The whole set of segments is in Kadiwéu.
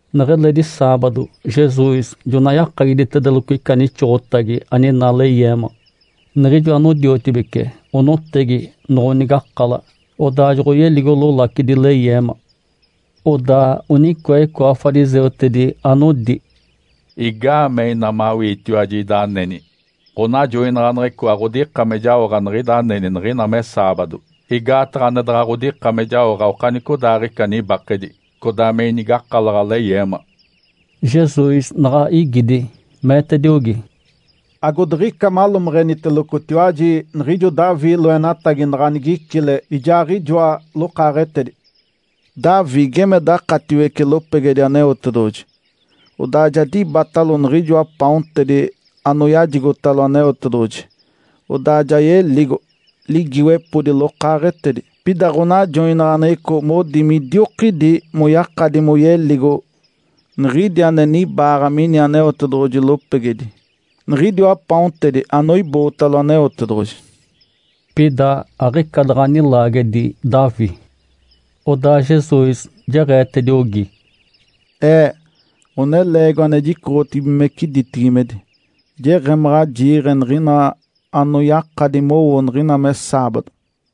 Neɡ̶eledi saabado Jesus jonaɡ̶a yakagiditedeloco ica nixoɡ̶otagi aninaa leyeema. Niɡ̶ijo anodiotibece onotegi noɡ̶onigakala, odaa joɡ̶oyeligo lolacidi leyeema. Odaa onicoa icoa fariseutedi anodi, “Igaamee ina mawiitiwaji ida aneni, ɡ̶onajoinaɡ̶aneɡ̶eco aɡ̶odika me jaoɡ̶a niɡ̶ida aneni niɡ̶ina me saabado? (Igaataɡ̶a ane daɡ̶a ɡ̶odika me jaoɡ̶a okanicodaaɡ̶ica nibakedi codaa me inigakalaɡ̶a leyeema).” Jesus naɡ̶a igidi, meetediogi, “Agodiɡ̶ica malomeɡ̶enitelocotiwaji, niɡ̶ijo Davi loenatagi, naɡ̶a nigicile, ijaaɡ̶ijoa lokaaɡ̶etedi. Davi geme dakatiwece lopegedi Aneotedoɡ̶oji. Odaa ja dibatalo niɡ̶ijoa paontedi anoyajigotalo Aneotedoɡ̶oji, odaa ja yeligo, ligiiwepodi lokaaɡ̶etedi. Pida ɡ̶onajoinaɡ̶aneɡ̶eco modi midiokidi moyakadi moyeligo niɡ̶idi ane nibaaɡ̶a mini Aneotedoɡ̶oji lopegedi, niɡ̶idiwa paontedi anoibootalo Aneotedoɡ̶oji.” (Pida aɡ̶ica daɡ̶a nilaagedi Davi.) Odaa Jesus jeɡ̶eetediogi, “Ee, Ǥoneleegiwa ane jicoɡ̶otibigimece ditibigimedi, jeɡ̶emaɡ̶a jiiɡ̶e niɡ̶ina anoyakadi mowo niɡ̶ina me saabado.”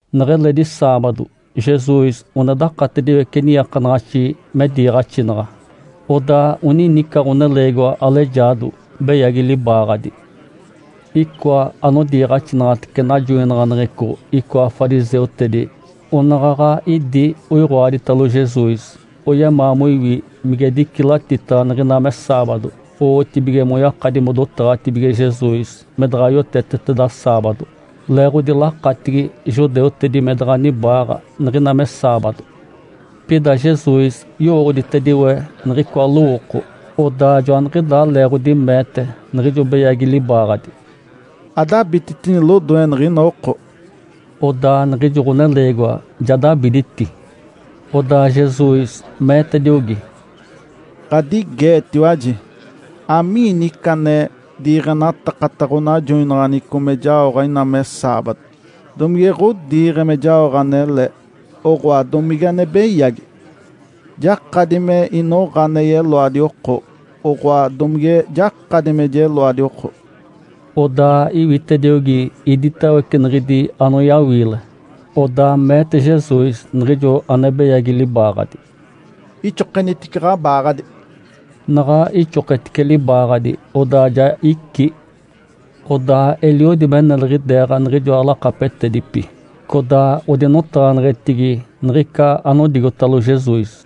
Neɡ̶eledi saabado, Jesus one dakatediwece niiakanaɡ̶axi me diiɡ̶axinaɡ̶a. Odaa oninica ɡ̶oneleegiwa alejaado, beyagi libaaɡ̶adi. Icoa anodiiɡ̶axinaɡ̶atece najoinaɡ̶aneɡ̶eco icoa fariseutedi, anaɡ̶aɡ̶a idi oiɡ̶oaditalo Jesus, oyemaa moiwi mige dicilatitaɡ̶a niɡ̶ina me saabado. Owotibige moyakadi modotaɡ̶atibige Jesus me daɡ̶a yoteteteda saabado. (Leeɡ̶odi lakatigi judeutedi me daɡ̶a nibaaɡ̶a niɡ̶ina me saabado.) Pida Jesus yowooɡ̶oditediwe niɡ̶icoa lowooko. Odaa joaniɡ̶idaa leeɡ̶odi meete niɡ̶ijo beyagi libaaɡ̶adi, “Adabititini lodoe niɡ̶ina oko!” Odaa niɡ̶ijo ɡ̶oneleegiwa ja dabiditi. Odaa Jesus meetediogi, “Ǥadigeetiwaji, amiini ica ane diiɡ̶enatakata ɡ̶onajoinaɡ̶aneɡ̶eco me jaoɡ̶a ina me saabado? Domige ɡ̶odiiɡ̶e me jaoɡ̶a anele, oɡ̶oa, domige ane beyagi? Jakadi me inoɡ̶a ane yeloadi oko, oɡ̶oa domige jakadi me jeloadi oko?” Odaa iwitediogi iditawece niɡ̶idi anoyawiile. Odaa meete Jesus niɡ̶ijo ane beyagi libaaɡ̶adi, “Ixokenitice ɡ̶abaaɡ̶adi!” Naɡ̶a ixoketice libaaɡ̶adi, odaa ja icí. Odaa eliodi me neliɡ̶ideeɡ̶a niɡ̶ijoa lakapetedipi, codaa odinotaɡ̶aneɡ̶etigi niɡ̶ica anodigotalo Jesus.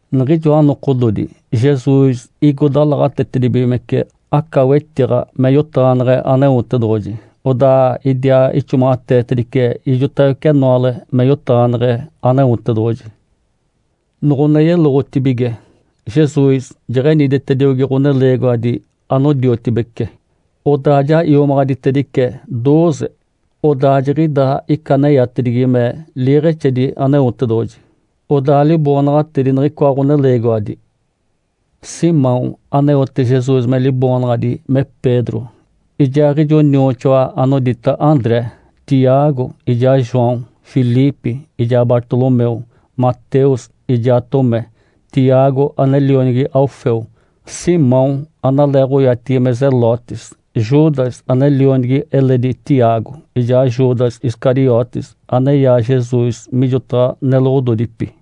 Niɡ̶ijoa nokododi, Jesus igo dalaɡ̶atetedibigimece aca wetiɡ̶a me yotaɡ̶aneɡ̶e Aneotedoɡ̶oji. Odaa idiaa ixomaɡ̶ateetedice ijotawece enoale me yotaɡ̶aneɡ̶e Aneotedoɡ̶oji. Noɡ̶one yeloɡ̶otibige, Jesus jeɡ̶eniditediogi ɡ̶oneleegiwadi anodiotibece. Odaa ja iomaɡ̶aditedice dooze, odaa joniɡ̶ida ica aneyatedigi me “Liiɡ̶exedi Aneotedoɡ̶oji.” Odaa liboonaɡ̶atedi niɡ̶icoa ɡ̶oneleegiwadi: Simão aneote Jesus me liboonaɡ̶adi me Pedro, ijaaɡ̶ijo nioxoa anodita André; Tiago, ijaa João, Filipe; ijaa Bartolomeu; Mateus ijaa Tomé; Tiago ane lionigi Alfeu; Simão analeeɡ̶oyatigi me Zelotes; Judas ane lionigi eledi Tiago; ijaa Judas Iscariotes aneyaa Jesus mijotaɡ̶a neloɡ̶ododipi.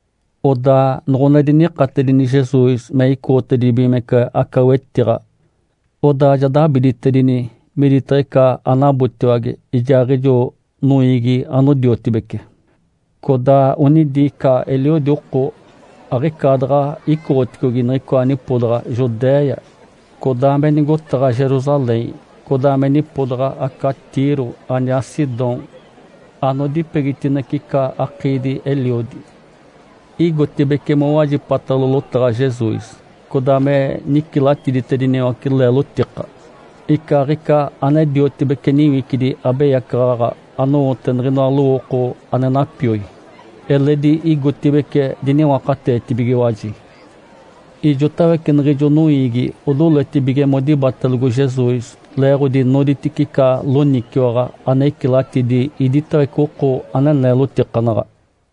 Odaa noɡ̶one dinikatedini Jesus me icoɡ̶otedibigimece aca wetiɡ̶a, odaa ja dabiditedini miditaɡ̶a ica anabotiwage ijaaɡ̶ijo noiigi anodiotibece. Codaa onidi ica eliodi oko aɡ̶icaadaɡ̶a icoɡ̶oticogi niɡ̶icoa nipodaɡ̶a Judéia, codaa me nigotaɡ̶a Jerusalém, codaa me nipodaɡ̶a aca Tiro aniaa Sidom, anodipegitinece ica akiidi-eliodi. Igotibeci mowajipatalo lotaɡ̶a Jesus, codaa me nicilatiditediniwace leelotika. Icaaɡ̶ica ane diotibece niwicidi abeyacaɡ̶aɡ̶a anowote niɡ̶inoa lowooko ane napioi, eledi igotibeci diniwakateetibigiwaji. Ijotawece niɡ̶ijo noiigi odoletibige modibatelogo Jesus, leeɡ̶odi noditice ica loniciwaɡ̶a ane icilatidi iditawece oko ane neelotikanaɡ̶a.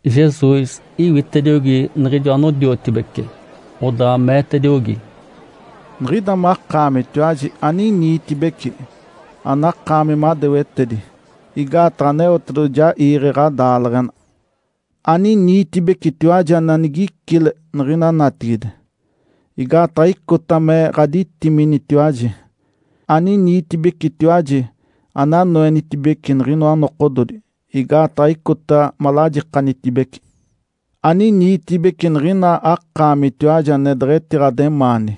Jesus iwitediogi niɡ̶ijo anodiotibece, odaa meetediogi, “Niɡ̶ida makaamitiwaji aniniitibeci, anakaami madewetedi, igaataɡ̶a Aneotedoɡ̶oji ja iiɡ̶e ɡ̶adaaleɡ̶ena. Aniniitibecitiwaji ane anigicile niɡ̶ina natigide, igaataɡ̶a icota me ɡ̶aditiminitiwaji. Aniniitibecitiwaji ane anoenitibece niɡ̶inoa nokododi, igaataɡ̶a icota malajikanitibece. Aniniitibeci niɡ̶ina akaamitiwaji ane deɡ̶etiɡ̶ademaani,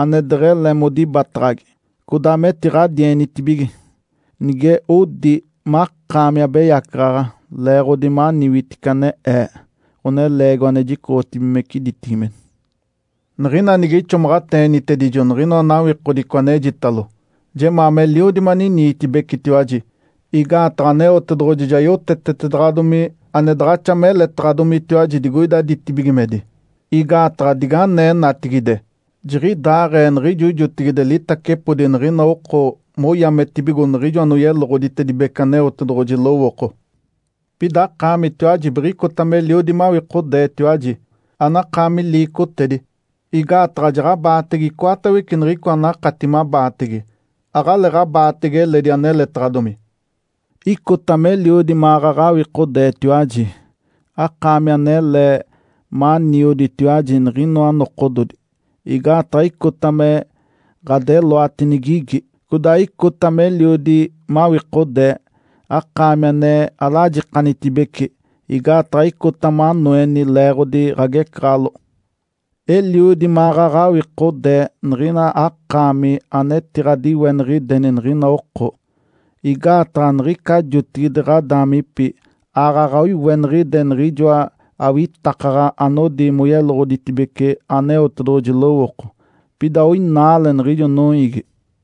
ane deɡ̶ele modibataɡ̶agi, codaa metiɡ̶adienitibige, nige odi makaami abeyacaɡ̶aɡ̶a, leeɡ̶odi maniwitici ane Ee, Ǥoneleegiwa ane jicoɡ̶otibigimece ditibigimedi. Niɡ̶ina nige ixomaɡ̶ateenitedijo niɡ̶inoa nawikodico anejitalo, jemaa meliodi maniniitibecitiwaji. Igaataɡ̶a Aneotedoɡ̶oji ja yotetetedaɡ̶adomi ane daɡ̶axa meletaɡ̶adomitiwaji digoida ditibigimedi. Igaataɡ̶a diganee natigide, jiɡ̶idaaɡ̶ee niɡ̶ijo jotigide litacepodi niɡ̶ina oko moyametibigo niɡ̶ijo anoyeloɡ̶oditedibece Aneotedoɡ̶oji lowooko. Pida akaamitiwaji biɡ̶icota meliodi mawikodeetiwaji, anakaami liicotedi, igaataɡ̶a jaɡ̶abaatege icoatawece niɡ̶icoa anakati mabaatege, aɡ̶aleeɡ̶abaatege eledi aneletaɡ̶adomi. Icota meliodi maɡ̶aɡ̶a awikodeetiwaji, akaami anele manioditiwaji niɡ̶inoa nokododi, igaataɡ̶a icota me ɡ̶adeloati nigigi. Codaa icota meliodi mawikodee, akaami ane alajikanitibece, igaataɡ̶a icota manoeni leeɡ̶odi ɡ̶agecaɡ̶aloɡ̶o. Eliodi maɡ̶aɡ̶a awikodee niɡ̶ina akaami anetiɡ̶adiweniɡ̶ideni niɡ̶ina oko, igaataɡ̶a niɡ̶ica jotigide ɡ̶adaamipi aaɡ̶aɡ̶a oiweniɡ̶ide niɡ̶ijoa awitakaɡ̶aɡ̶a anodi moyeloɡ̶oditedibece Aneotedoɡ̶oji lowooko. (Pida oinaale niɡ̶ijo noiigi.)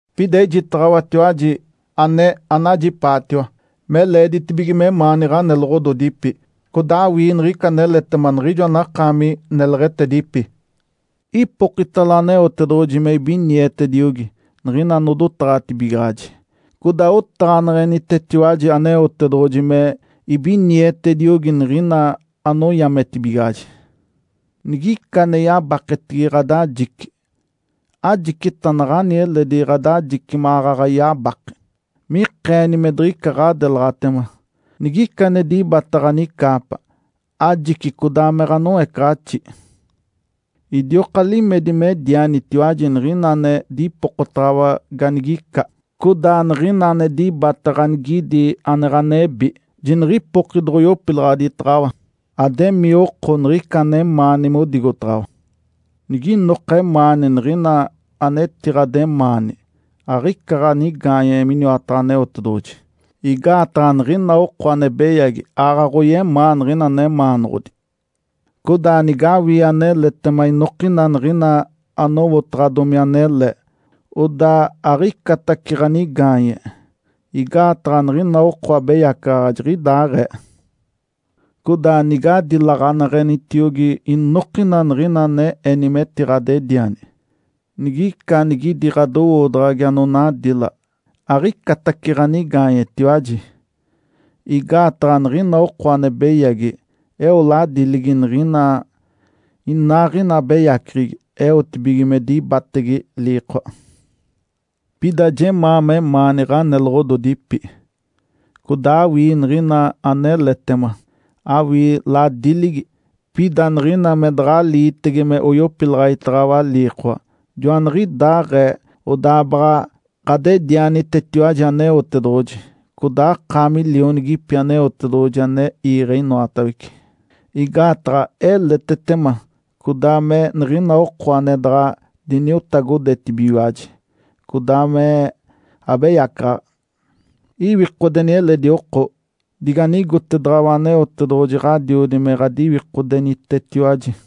Pida ejitaɡ̶awatiwaji ane anajipaatiwa, me leeditibige memaani ɡ̶oneloɡ̶ododipi, codaa awii niɡ̶ica aneletema niɡ̶ijo anakaami neleɡ̶etedipi. Ipokitalo Aneotedoɡ̶oji me ibinietediogi niɡ̶ina anodotaɡ̶atibigaɡ̶aji, codaa otaɡ̶aneɡ̶enitetiwaji Aneotedoɡ̶oji me ibinietediogi niɡ̶ina anoyametibigaɡ̶aji. Nigica ane yabaketigi ɡ̶adajice, ajicita naɡ̶ani eledi ɡ̶adajice maɡ̶aɡ̶a yabake. (Me ikeeni me diɡ̶ica ɡ̶adelaɡ̶atema.) Nigica ane dibata ɡ̶anicaapa ajici codaa me ɡ̶anoecaɡ̶axi. Idioka limedi medianitiwaji niɡ̶ina ane dipokotaɡ̶awa ganigica. Codaa niɡ̶ina ane dibata ganigidi ane ɡ̶anebi, jiniɡ̶ipoki doɡ̶oyopilaɡ̶aditaɡ̶awa. Ademii oko niɡ̶ica anemaani modigotaɡ̶awa. Niginoka emaani niɡ̶ina anetiɡ̶ademaani, aɡ̶ica ɡ̶anigaanye miniwataɡ̶a Aneotedoɡ̶oji. Igaataɡ̶a niɡ̶ina oko ane beyagi aaɡ̶aɡ̶oyemaa niɡ̶ina nemaanoɡ̶odi. Codaa nigawii aneletema inokina niɡ̶ina anowotaɡ̶adomi anele, odaa aɡ̶icatace ɡ̶anigaanye. Igaataɡ̶a niɡ̶ina oko abeyacaɡ̶aɡ̶a jiɡ̶idaaɡ̶ee. Codaa nigadilaɡ̶aneɡ̶enitiogi inokina niɡ̶ina ane eni metiɡ̶adediani, nigica anigidi ɡ̶adowoodaɡ̶agi anonadila, aɡ̶icatace ɡ̶anigaanyetiwaji. Igaataɡ̶a niɡ̶ina oko ane beyagi eo ladiligi niɡ̶ina inaaɡ̶ina abeyaceɡ̶egi eotibige me dibatege liikoa. Pida jemaa memaani ɡ̶aneloɡ̶ododipi, codaa awii niɡ̶ina aneletema, awii ladiligi, pida niɡ̶ina me daɡ̶a aliitege me yopilaɡ̶aditaɡ̶awa liikoa. Joaniɡ̶idaaɡ̶ee odaa baɡ̶a ɡ̶adedianitetiwaji Aneotedoɡ̶oji, codaa akaami lionigipi Aneotedoɡ̶oji ane iiɡ̶e inoatawece. Igaataɡ̶a eletetema codaa me niɡ̶ina oko ane daɡ̶a diniotagodetibigiwaji codaa me abeyacaɡ̶aɡ̶a. Iwikodeni eledi oko, diganigotedaɡ̶awa Aneotedoɡ̶oji Ǥadiodi me ɡ̶adiwikodenitetiwaji.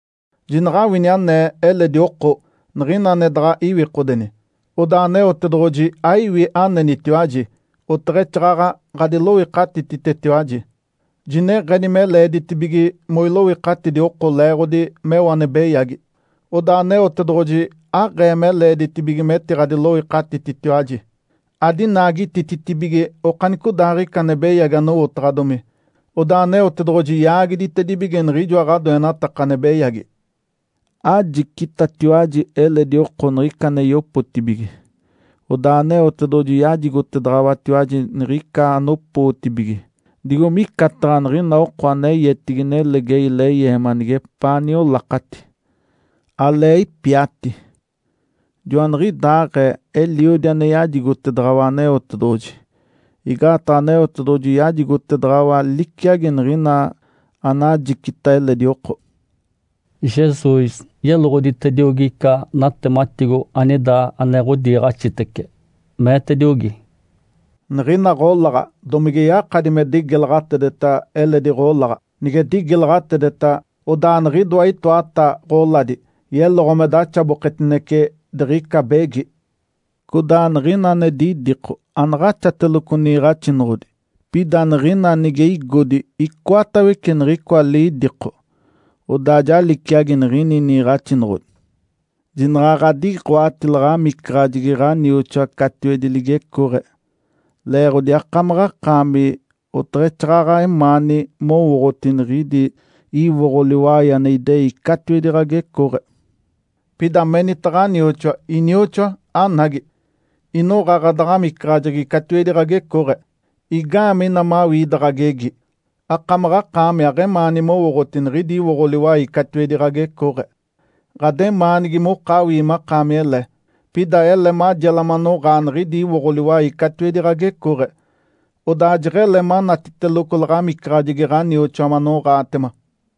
Jinaɡ̶awini anee eledi oko niɡ̶ina ane daɡ̶a iwikodeni, odaa Aneotedoɡ̶oji aiwi anenitiwaji oteɡ̶exaaɡ̶aɡ̶a ɡ̶adiloikatititetiwaji. Jineɡ̶eni me leeditibige moiloikatidi oko leeɡ̶odi meo ane beyagi. Odaa Aneotedoɡ̶oji aɡ̶ee me leeditibige metiɡ̶adiloikatititetiwaji. Adinaagitititibige okanicodaaɡ̶ica ane beyagi anowotaɡ̶adomi. Odaa Aneotedoɡ̶oji yaagiditedibige niɡ̶ijoa ɡ̶adoenataka ane beyagi. Ajicitatiwaji eledi oko niɡ̶ica ane yopotibige, odaa Aneotedoɡ̶oji yajigotedaɡ̶awatiwaji niɡ̶ica anopootibige. Digo micataɡ̶a niɡ̶ina oko ane yetigi nelegei leyeema neɡ̶epaa niolakati, alee ipiati, joaniɡ̶idaaɡ̶ee eliodi ane yajigotedaɡ̶awa Aneotedoɡ̶oji. Igaataɡ̶a Aneotedoɡ̶oji yajigotedaɡ̶awa liciagi niɡ̶ina anajicita eledi oko.” Jesus yeloɡ̶oditediogi ica natematigo anida ane ɡ̶odiiɡ̶axitece, meetediogi, “Niɡ̶ina ɡ̶olaɡ̶a domige yakadi me digilaɡ̶atedeta eledi ɡ̶olaɡ̶a? Nige digilaɡ̶atedeta, odaa niɡ̶idoa itoata ɡ̶oladi yeloɡ̶o me daxaboketinece diɡ̶ica begi. Codaa niɡ̶ina ane didiko anaɡ̶axateloco niiɡ̶axinoɡ̶odi. Pida niɡ̶ina nige igodi icoatawece niɡ̶icoa lidiko, odaa ja liciagi niɡ̶ini niiɡ̶axinoɡ̶odi. Jinaɡ̶a ɡ̶adiɡ̶oati laɡ̶amicaɡ̶ajegi ɡ̶anioxoa catiwedi ligecooɡ̶e, leeɡ̶odi akamaɡ̶akaami oteɡ̶exaaɡ̶aɡ̶a emaani mowooɡ̶oti niɡ̶idi iwoɡ̶o liwai ane idei catiwedi ɡ̶agecooɡ̶e. Pida menita ɡ̶anioxoa, ‘Inioxoa, anagi! Inoɡ̶a ɡ̶adaɡ̶amicaɡ̶ajegi catiwedi ɡ̶agecooɡ̶e.’ Igaamee ina mawii ida ɡ̶agegi, akamaɡ̶akaami aɡ̶emaani mowooɡ̶oti niɡ̶idi iwoɡ̶o liwai catiwedi ɡ̶agecooɡ̶e? Ǥademaanigi mokawii makaami ele. Pida ele majela manoɡ̶aa niɡ̶idi iwoɡ̶o liwai catiwedi ɡ̶agecooɡ̶e, odaa jeɡ̶ele manatiteloco laɡ̶amicaɡ̶ajegi ɡ̶anioxoa manoɡ̶aatema.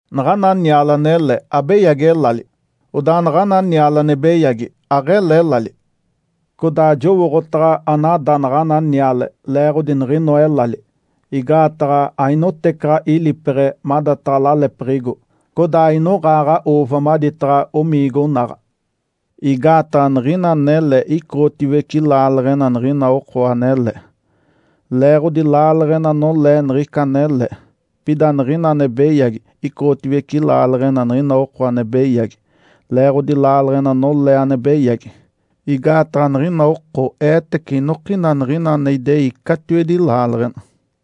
Naɡ̶ana niale anele, abeyagi elali. Odaa naɡ̶ana niale ane beyagi, aɡ̶ele elali. Codaa jowooɡ̶otaɡ̶a anada naɡ̶ana niale leeɡ̶odi niɡ̶inoa elali. Igaataɡ̶a ainotecaɡ̶a ilipeɡ̶e madataɡ̶a lalepiɡ̶igo, codaa ainoɡ̶aaɡ̶a ‘uuva’ maditaɡ̶a omiigonaɡ̶a. Igaataɡ̶a niɡ̶ina anele icoɡ̶otiwece laaleɡ̶ena niɡ̶ina oko anele, leeɡ̶odi laaleɡ̶ena nolee niɡ̶ica anele. Pida niɡ̶ina ane beyagi icoɡ̶otiwece laaleɡ̶ena niɡ̶ina oko ane beyagi, leeɡ̶odi laaleɡ̶ena nolee ane beyagi. Igaataɡ̶a niɡ̶ina oko eetece inokina niɡ̶ina ane idei catiwedi laaleɡ̶ena.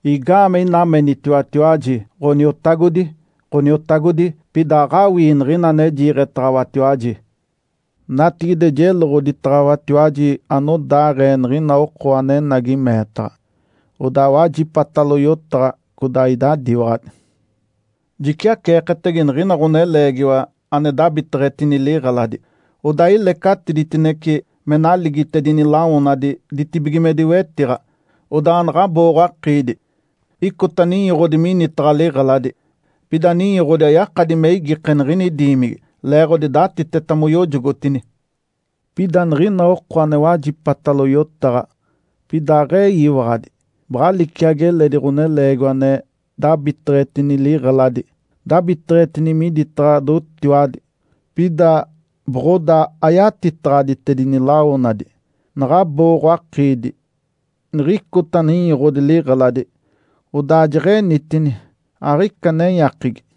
Igaamee ina menitiwatiwaji, ‘Ǥoniotagodi, Ǥoniotagodi,’ pida aɡ̶awii niɡ̶ina ane jiiɡ̶etaɡ̶awatiwaji? Natigide jeloɡ̶oditaɡ̶awatiwaji anodaaɡ̶ee niɡ̶ina oko anenagi meetaɡ̶a, odaa wajipatalo yotaɡ̶a, codaa idadiwaɡ̶adi. Jiciaceeketege niɡ̶ina ɡ̶oneleegiwa ane dabiteɡ̶etini liɡ̶eladi. Odaa ilecatiditinece me naligitedini lawonadi ditibigimedi wetiɡ̶a. Odaa naɡ̶a abooɡ̶o-akiidi, icota ninyoɡ̶odi minitaɡ̶a liɡ̶eladi. Pida ninyoɡ̶odi ayakadi me igike niɡ̶ini diimigi, leeɡ̶odi datiteta moyojogotini. Pida niɡ̶ina oko ane wajipatalo yotaɡ̶a, pida aɡ̶eyiwaɡ̶adi, baɡ̶a liciagi eledi ɡ̶oneleegiwa ane dabiteɡ̶etini liɡ̶eladi. Dabiteɡ̶etini miditaɡ̶a dotiwadi, pida boɡ̶odaa ayatitaɡ̶aditedini lawonadi. Naɡ̶a abooɡ̶o-akiidi, niɡ̶icota ninyoɡ̶odi liɡ̶eladi. Odaa jeɡ̶enitini, aɡ̶ica nenyakigi.”